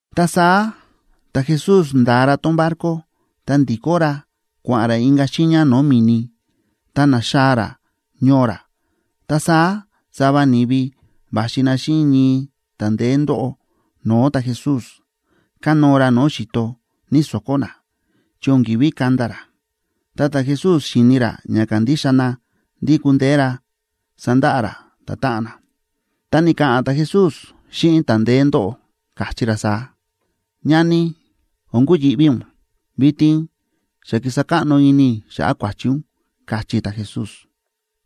Ta saá ta̱Jesús nda̱a ra tón barco, ta ndi̱kó ra kua̱ꞌa̱n ra inka̱ xiiña no̱o̱ mi̱ni, ta na̱xaa̱ ra ñoo ra. Ta saá sava ni̱vi va̱xi na xíꞌin ñii ta̱ ndeé ndóꞌo no̱o̱ ta̱Jesús, kánóo ra no̱o̱ xi̱to, ñíso̱kó na, chi o̱n ki̱ví kanda ra. Tá ta̱Jesús xi̱ni ra ña kándixa na ndí kúndeé ra sandaꞌa ra ta̱táꞌan na, ta ni̱ka̱ꞌa̱n ta̱Jesús xíꞌin ta̱ ndeé ndóꞌo, káchí ra saá: ―Ñani, o̱n kuyi̱ꞌví ún. Vitin xa ki̱sa káꞌno ini i̱ xa̱ꞌa̱ kua̱chi ún ―káchí ta̱Jesús.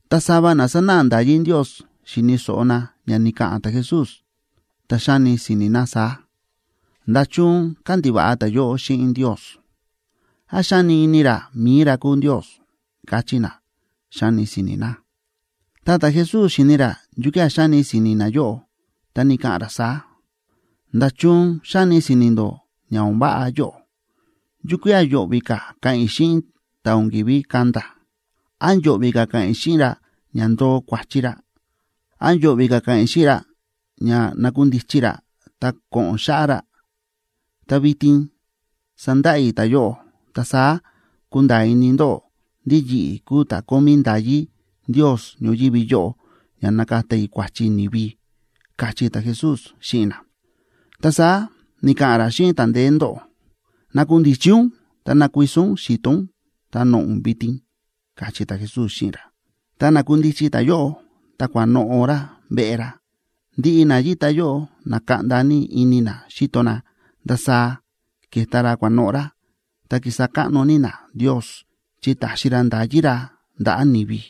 Ta sava na sánáꞌa nda̱yí Ndios xi̱ni̱ so̱ꞌo na ña ni̱ka̱ꞌa̱n ta̱Jesús, ta xáni si̱ni̱ na saá: “¿Nda̱chun kándiva̱ꞌa ta̱yóꞌo xíꞌin Ndios? ¿Án xáni ini ra mi̱i ra kúu Ndios?”, káchí na, xáni si̱ni̱ na. Ta ta̱Jesús xíni̱ ra yukía̱ xáni si̱ni̱ nayóꞌo, ta ni̱ka̱ꞌa̱n ra saá: ―¿Nda̱chun xáni si̱ni̱ ndó ña o̱n váꞌa yóꞌo? ¿Yukía̱ yo̱ꞌvi̱ ka̱ ka̱ꞌa̱n i̱ xíꞌin ta̱ o̱n ki̱ví kanda? ¿Án yo̱ꞌvi̱ ka̱ ka̱ꞌa̱n i̱ xíꞌin ra ña ndoo kua̱chi ra? ¿Án yo̱ꞌvi̱ ka̱ ka̱ꞌa̱n i̱ xíꞌin ra ña nakundichi ra, ta ko̱ꞌo̱n xáꞌá ra? Ta vitin sandaꞌa i̱ ta̱yóꞌo, ta saá kunda̱a̱ ini ndóꞌó ndí yi̱ꞌi̱ kúu ta̱ kómí nda̱yí Ndios ñoyívi yóꞌo ña nakata i̱ kua̱chi ni̱vi ―káchí ta̱Jesús xíꞌin na. Ta saá ni̱ka̱ꞌa̱n ra xíꞌin ta̱ ndeé ndóꞌo: ―Nakundichi ún ta ná kuiso ún xi̱to ún, ta noꞌo̱ ún vitin ―káchí ta̱Jesús xíꞌin ra. Ta na̱kundichi ta̱yóꞌo, ta kua̱noꞌo̱ ra veꞌe ra. Ndiꞌi na yíta yóꞌo na̱kaꞌnda ní ini na xíto na ndasaá ke̱ta ra kua̱noꞌo̱ ra, ta ki̱sa káꞌno ní na Ndios, chi ta̱xi ra nda̱yí ra ndaꞌa̱ ni̱vi.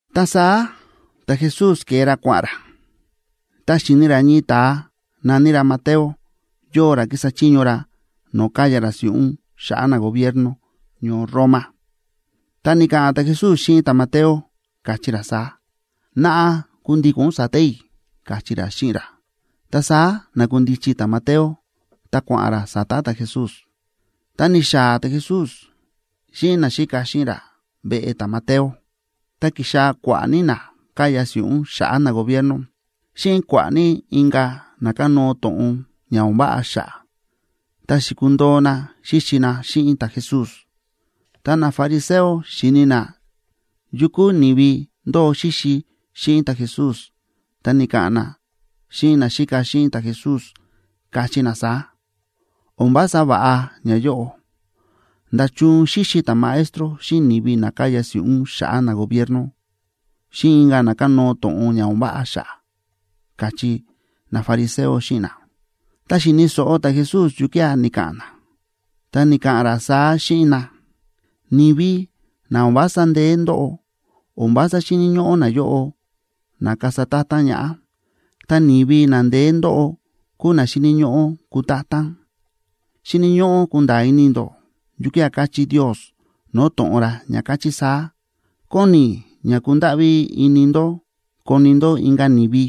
Ta saá ta̱Jesús ke̱e ra kua̱ꞌa̱n ra, ta̱ xi̱ni ra ñii ta̱a na̱ní ra Mateo, yóo ra kísa chiño ra no̱o̱ káya ra si̱ꞌún xa̱ꞌa̱ nagobierno ñoo Roma. Ta ni̱ka̱ꞌa̱n ta̱Jesús xíꞌin ta̱Mateo, káchí ra saá: ―Naꞌa, kundíko̱n ún sa̱ta̱ i̱ ―káchí ra xíꞌin ra. Ta saá na̱kundichi ta̱Mateo, ta kua̱ꞌa̱n ra sa̱ta̱ ta̱Jesús. Tá ni̱xaa̱ ta̱Jesús xíꞌin naxíka xíꞌin ra veꞌe ta̱Mateo, ta ki̱xaa̱ kua̱ꞌa̱ ní na káya si̱ꞌún xa̱ꞌa̱ nagobierno xíꞌin kua̱ꞌa̱ ní inka̱ na kánóo to̱ꞌon ña o̱n váꞌa xa̱ꞌa̱, ta xi̱kundoo na xíxi na xíꞌin ta̱Jesús. Ta nafariseo xi̱ni na yu kúu ni̱vi ndóo xíxi xíꞌin ta̱Jesús, ta ni̱ka̱ꞌa̱n na xíꞌin naxíka xíꞌin ta̱Jesús, káchí na saá: ―O̱n vása va̱ꞌa ñayóꞌo. ¿Nda̱chun xíxi ta̱Maestro xíꞌin ni̱vi na káya si̱ꞌún xa̱ꞌa̱ nagobierno, xíꞌin inka̱ na kánóo to̱ꞌon ña o̱n váꞌa xa̱ꞌa̱? ―káchí nafariseo xíꞌin na. Ta xi̱ni̱ so̱ꞌo ta̱Jesús yukía̱ ni̱ka̱ꞌa̱n na, ta ni̱ka̱ꞌa̱n ra saá xíꞌin na: ―Ni̱vi na o̱n vása ndeé ndóꞌo, o̱n vása xíni̱ ñóꞌó nayóꞌo na kasa ta̱ta̱n ñaꞌá, ta ni̱vi na ndeé ndóꞌo kúu na xíni̱ ñóꞌó kutátán. Xíni̱ ñóꞌó kunda̱a̱ ini ndó yukía̱ káchí Ndios no̱o̱ to̱ꞌon ra, ña káchí saá: “Kóni i̱ ña kundáꞌví ini ndó koni ndó inka̱ ni̱vi,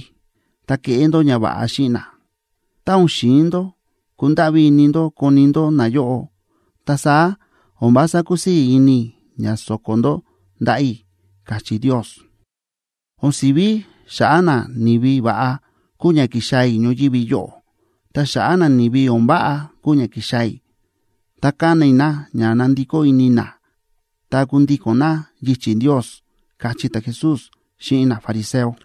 ta keꞌé ndó ñava̱ꞌa xíꞌin na. Tá o̱n xi̱in ndó kundáꞌví ini ndó koni ndó nayóꞌo, ta saá o̱n vása kusii̱ ini i̱ ña so̱ko̱ ndó ndaꞌa̱ i̱”, káchí Ndios. O̱n si̱ví xa̱ꞌa̱ nani̱vi va̱ꞌa kúu ña ki̱xaa̱ i̱ ñoyívi yóꞌo. Ta xa̱ꞌa̱ nani̱vi o̱n váꞌa kúu ña ki̱xaa̱ i̱, ta kana i̱ na ña nandikó ini na ta kundíko̱n na yichi̱ Ndios ―káchí ta̱Jesús xíꞌin nafariseo.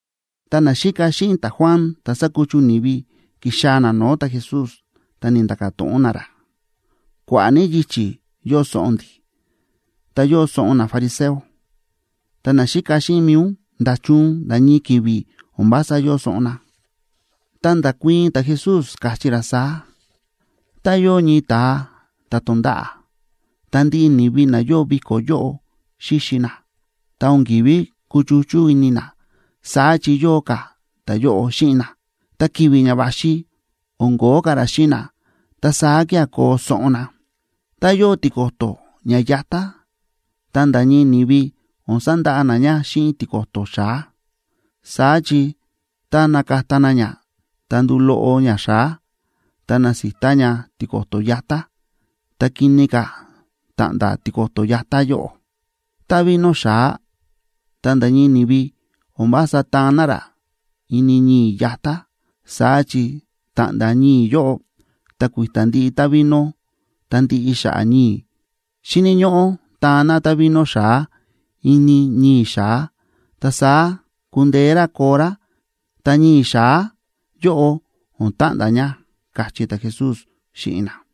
Ta naxíka xíꞌin ta̱Juan ta̱ sa̱kuchu ni̱vi, ki̱xaa̱ na no̱o̱ ta̱Jesús, ta ni̱nda̱ka̱ to̱ꞌon na ra: ―Kua̱ꞌa̱ ní yichi̱ yóo soꞌon ndi̱, ta yóo soꞌon nafariseo. Ta naxíka xíꞌin mi̱i ún, ¿nda̱chun nda̱ ñii ki̱vi̱ o̱n vása yóo soꞌon na? Ta nda̱kuii̱n ta̱Jesús, káchí ra saá: ―Tá yóo ñii ta̱a ta̱ tonda̱ꞌa̱, ta ndiꞌi ni̱vi na yóo viko̱ yóꞌo xíxi na, ta o̱n ki̱ví kuchuchú ini na, saá chi yóo ka̱ ta̱yóꞌo xíꞌin na. Ta ki̱vi̱ ña va̱xi o̱n kóo ka̱ ra xíꞌin na. Ta saá kía̱ koo soꞌon na. ’Tá yóo tiko̱to̱ ña yatá, ta nda̱ ñii ni̱vi o̱n sandaꞌa na ña xíꞌin tiko̱to̱ xa̱á, saá chi tá nakata na ña, ta nduu loꞌo ña xa̱á, ta nasita ña tiko̱to̱ yatá, ta kini ka̱ ta̱ꞌnda̱ tiko̱to̱ yatá yóꞌo. Ta vino xa̱á, ta nda̱ ñii ni̱vi o̱n vása táan na rá ini ñii̱ yatá, saá chi ta̱ꞌnda̱ ñii̱ yóꞌo, ta kui̱ta̱ ndiꞌi távino ta ndiꞌi xa̱ꞌa̱ ñii̱. Xíni̱ ñóꞌó taan na távino xa̱á ini ñii̱ xa̱á, ta saá kundeé rá koo rá, ta ñii̱ xa̱á yóꞌo o̱n ta̱ꞌnda̱ ña ―káchí ta̱Jesús xíꞌin na.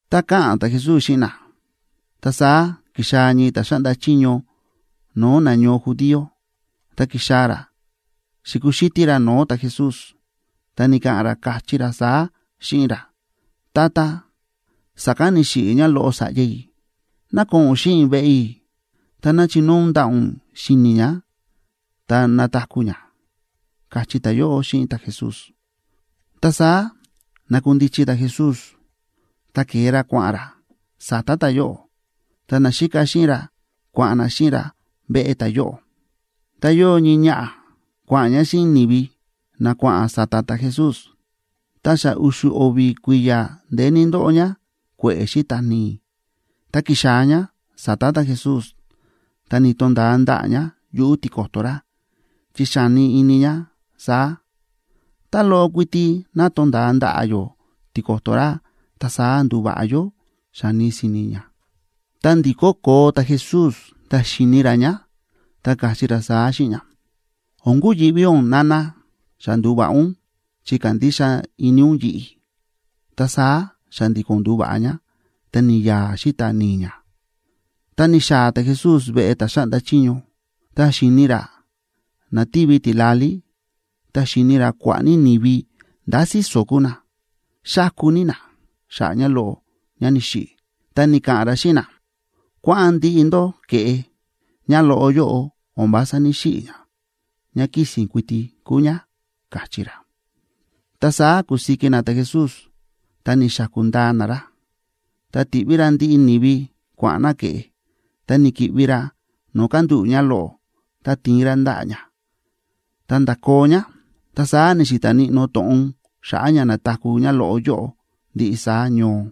Tá káꞌa̱n ta̱Jesús xíꞌin na, ta saá ki̱xaa̱ ñii ta̱ xáꞌnda chiño no̱o̱ nañoo judío, ta ki̱xaa̱ ra xi̱kuxítí ra no̱o̱ ta̱Jesús, ta ni̱ka̱ꞌa̱n ra, káchí ra saá xíꞌin ra: ―Tata, sa̱kán ni̱xiꞌi̱ ñáloꞌo sa̱ꞌya i̱. Ná ko̱ꞌo̱n ún xíꞌin i̱ veꞌe i̱, ta ná chinóo ún ndaꞌa̱ ún si̱ni̱ ñá, ta nataku̱ ñá ―káchí ta̱yóꞌo xíꞌin ta̱Jesús. Ta saá na̱kundichi ta̱Jesús, ta ke̱e ra kua̱ꞌa̱n ra sa̱ta̱ ta̱yóꞌo, ta naxíka xíꞌin ra kua̱ꞌa̱n na xíꞌin ra veꞌe ta̱yóꞌo. Ta yóo ñii ñaꞌa̱ kua̱ꞌa̱n ñá xíꞌin ni̱vi na kua̱ꞌa̱n sa̱ta̱ ta̱Jesús. Ta xa u̱xu̱ o̱vi̱ kui̱ya̱ ndeé ní ndóꞌo ñá kue̱ꞌe̱ xíta̱ ni̱i̱. Ta ki̱xaa̱ ñá sa̱ta̱ ta̱Jesús, ta ni̱to̱nda̱a ndaꞌa̱ ñá yuꞌu̱ tiko̱to̱ ra, chi xáni ini ñá saá: “Tá loꞌo kuiti ná tonda̱a ndaꞌa̱ yó tiko̱to̱ ra, ta saá nduva̱ꞌa yó”, xáni si̱ni̱ ñá. Ta ndi̱kó koo ta̱Jesús ta xi̱ni ra ñá, ta káchí ra saá xíꞌin ñá: ―O̱n kuyi̱ꞌví ún, nana. Xa ndu̱va̱ꞌa ún chi kándixa ini ún yi̱ꞌi̱. Ta saá xa̱ndi̱ko̱n ndu̱va̱ꞌa ñá, ta ni̱ya̱a̱ xíta̱ ni̱i̱ ñá. Ta ni̱xaa̱ ta̱Jesús veꞌe ta̱ xáꞌnda chiño. Ta xi̱ni ra na tívi tila̱lí, ta xi̱ni ra kua̱ꞌa̱ ní ni̱vi ndá síso̱ kúu na, xáku ní na xa̱ꞌa̱ ñáloꞌo ñá ni̱xiꞌi̱. Ta ni̱ka̱ꞌa̱n ra xíꞌin na: ―Kua̱ꞌa̱n ndiꞌi ndó keꞌé. Ñáloꞌo yóꞌo o̱n vása ní‑xiꞌi̱ ñá, ñá kísi̱n kuiti kúu ñá ―káchí ra. Ta saá ku̱siki na ta̱Jesús ta ni̱xaku̱ ndaa na ra. Ta ti̱ꞌví ra ndiꞌi ni̱vi kua̱ꞌa̱n na ke̱ꞌe, ta ni̱ki̱ꞌvi ra no̱o̱ kándúꞌu̱ ñáloꞌo, ta ti̱in ra ndaꞌa̱ ñá, ta nda̱koo ñá. Ta saá ni̱xi̱ta̱ níꞌnó to̱ꞌon xa̱ꞌa̱ ña na̱taku̱ ñáloꞌo yóꞌo ndiꞌi saá ñoo.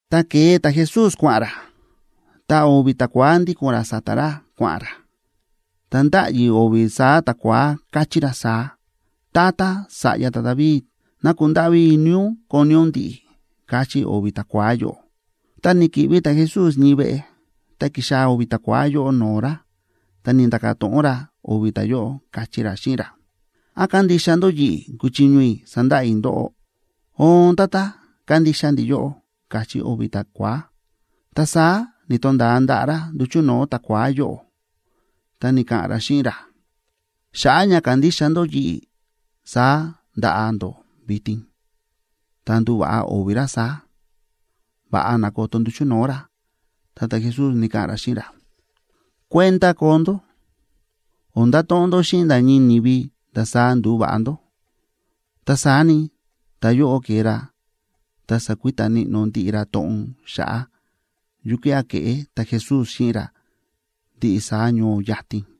Ta ke̱e ta̱Jesús kua̱ꞌa̱n ra, ta o̱vi̱ ta̱kua̱á ndíko̱n ra sa̱ta̱ ra kua̱ꞌa̱n ra, ta ndáꞌyi o̱vi̱ saá ta̱kua̱á, káchí ra saá: ―Tata, sa̱ꞌya ta̱David,a ¡ná kundáꞌví ini ún koni ún ndi̱ꞌi̱! ―káchí o̱vi̱ ta̱kua̱á yóꞌo. Tá ni̱ki̱ꞌvi ta̱Jesús ñii veꞌe, ta ki̱xaa̱ o̱vi̱ ta̱kua̱á yóꞌo no̱o̱ ra, ta ni̱nda̱ka̱ to̱ꞌon ra o̱vi̱ ta̱yóꞌo, káchí ra xíꞌin ra: ―¿Án kándixa ndó yi̱ꞌi̱ kúchiño i̱ sandaꞌa i̱ ndóꞌó? ―Oon, Tata, kándixa ndi̱ yóꞌó ―káchí o̱vi̱ ta̱kua̱á. Ta saá ni̱to̱nda̱a ndaꞌa̱ ra nduchu̱ no̱o̱ ta̱kua̱á yóꞌo, ta ni̱ka̱ꞌa̱n ra xíꞌin ra: ―Xa̱ꞌa̱ ña kándixa ndó yi̱ꞌi̱ saá ndaꞌa ndó vitin. Ta ndu̱va̱ꞌa o̱vi̱ ra saá, va̱ꞌa na̱koto nduchu̱ no̱o̱ ra. Ta ta̱Jesús ni̱ka̱ꞌa̱n ra xíꞌin ra: ―Kuenda koo ndó, o̱n ndato̱ꞌon ndó xíꞌin nda̱ ñii ni̱vi ndasaá ndu̱va̱ꞌa ndó. Ta saá ni, ta̱yóꞌo ke̱e ra ta sa̱kuita níꞌnó ndiꞌi ra to̱ꞌon xa̱ꞌa̱ yukía̱ ke̱ꞌé ta̱Jesús xíꞌin ra ndiꞌi saá ñoo yatin.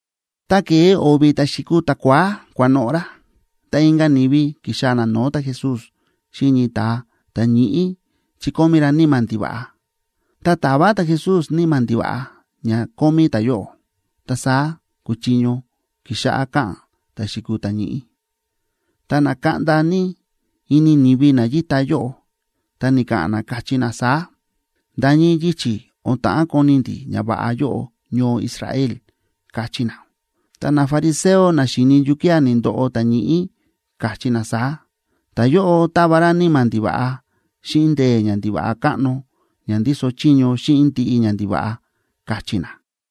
Tá ke̱e o̱vi̱ ta̱ xi̱kuu ta̱kua̱á kua̱noꞌo̱ ra, ta inka̱ ni̱vi ki̱xaa̱ na no̱o̱ ta̱Jesús xíꞌin ñii ta̱a ta̱ ñíꞌí chi kómí ra níma̱ ndiva̱ꞌa. Ta ta̱va ta̱Jesús níma̱ ndiva̱ꞌa ña kómí ta̱yóꞌo, ta saá kúchiño kixáꞌá ka̱ꞌa̱n ta̱ xi̱kuu ta̱ ñíꞌí. Ta na̱kaꞌnda ní ini ni̱vi na yíta yóꞌo, ta ni̱ka̱ꞌa̱n na, káchí na saá: ―¡Nda̱ ñii yichi̱ o̱n ta̱ꞌán koni ndi̱ ñava̱ꞌa yóꞌo ñoo Israel! ―káchí na. Ta nafariseo na xi̱ni yukía̱ ni̱ndoꞌo ta̱ ñíꞌí, káchí na saá: ―Ta̱yóꞌo táva ra níma̱ ndiva̱ꞌa xíꞌin ndee̱ ñandiva̱ꞌa káꞌno ña ndíso chiño xíꞌin ndiꞌi ñandiva̱ꞌa ―káchí na.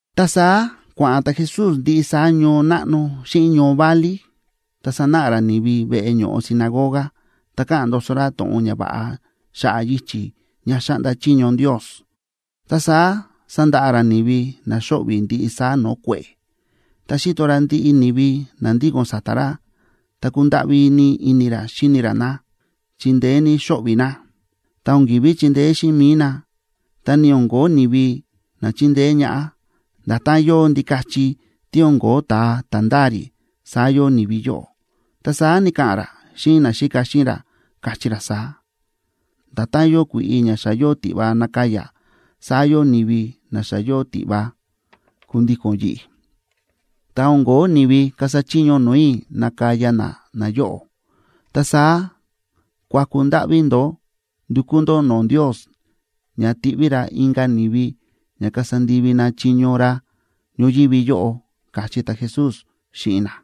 Ta saá kua̱ꞌa̱n ta̱Jesús ndiꞌi saá ñoo náꞌno xíꞌin ñoo válí, ta sánáꞌa ra ni̱vi veꞌe ño̱ꞌo sinagoga, ta káꞌa̱n ndoso ra to̱ꞌon ñava̱ꞌa xa̱ꞌa̱ yichi̱ ña xáꞌnda chiño Ndios, ta saá sándaꞌa ra ni̱vi na xóꞌvi̱ ndiꞌi saá no̱o̱ kue̱ꞌe̱. Tá xi̱to ra ndiꞌi ni̱vi na ndíko̱n sa̱ta̱ ra, ta kúndáꞌví ní ini ra xíni ra na, chi ndeé ní xóꞌvi̱ na. Ta o̱n ki̱ví chindeé xíꞌin mi̱i na, ta ni o̱n ko̱ó ni̱vi na chindeé ñaꞌá. Nda̱tán yóo ndikachi tí o̱n ko̱ó ta̱a ta̱ ndáa rí, saá yóo ni̱vi yóꞌo. Ta saá ni̱ka̱ꞌa̱n ra xíꞌin naxíka xíꞌin ra, káchí ra saá: ―Nda̱tán yóo kui̱ꞌi ña xa yóo tiꞌva nakaya, saá yóo ni̱vi na xa yóo tiꞌva kundíko̱n yi̱ꞌi̱, ta o̱n ko̱ó ni̱vi kasa chiño no̱o̱ i̱ nakaya na nayóꞌo. Ta saá kuaku ndáꞌví ndó ndukú ndó no̱o̱ Ndios ña tiꞌví ra inka̱ ni̱vi ña kasa ndivi na chiño ra ñoyívi yóꞌo ―káchí ta̱Jesús xíꞌin na.